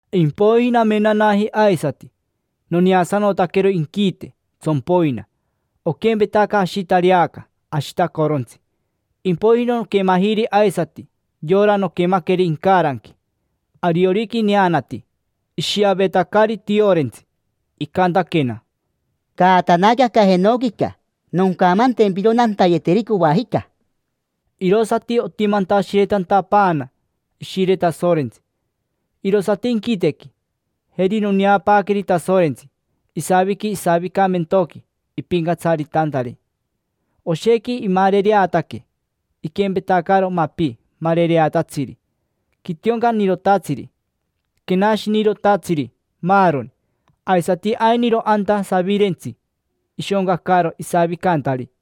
Impoiji namenanaji aisati, noneasanotaquero inquite, tsompoina; oquempetaca ashitareaca ashitacorontsi. Impoiji noquemajiri aisati yora noquemaqueri incaranqui, ariorica ineanati ishiavetacari tiorentsi. Icantaquena: —Caatanaque aca jenoquica. Noncamantempiro nantayeteri coajica. Irosati otentashiretantanaquena Ishire Tasorentsi, irosati inquitequi. Jeri noneapaaqueri Tasorentsi, isaviqui isavicamentoqui ipincatsaritantari. Oshequi imarereataque, iquempetacaro mapi marereatatsiri: quitioncanirotatsiri, quenashinirotatsiri, maaroni. Aisati ainiro anta savirentsi, ishoncacaro isavicantari.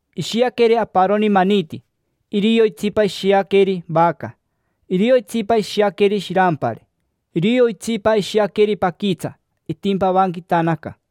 Ishiaqueri aparoni maniti; irio itsipa ishiaqueri vaca; irio itsipa ishiaqueri shirampari; irio itsipa ishiaqueri paquitsa, itimpavanquitanaca.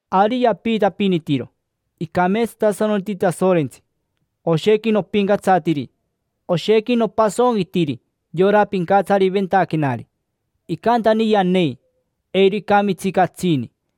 Ari yapiitapinitiro: Icameetsatasanoti Tasorentsi, oshequi nopincatsatiri. Oshequi nopasonquitiri yora pincatsariventaquenari. Icantani yanei, eiro icamitsi catsini.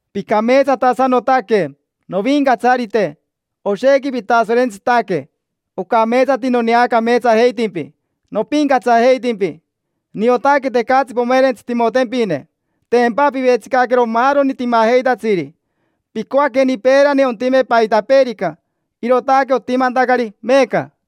Picameetsatasanotaque, Novincatsarite, oshequi pitasorentsitaque. Ocameetsati noneacameetsajeitimpi, nopincatsajeitimpi. Niotaque tecatsi pomerentsitimotempine: tempa pivetsicaquero maaroni timajeitatsiri. Picoaqueni peerani ontime paitapeerica, irootaque otimantacari meeca.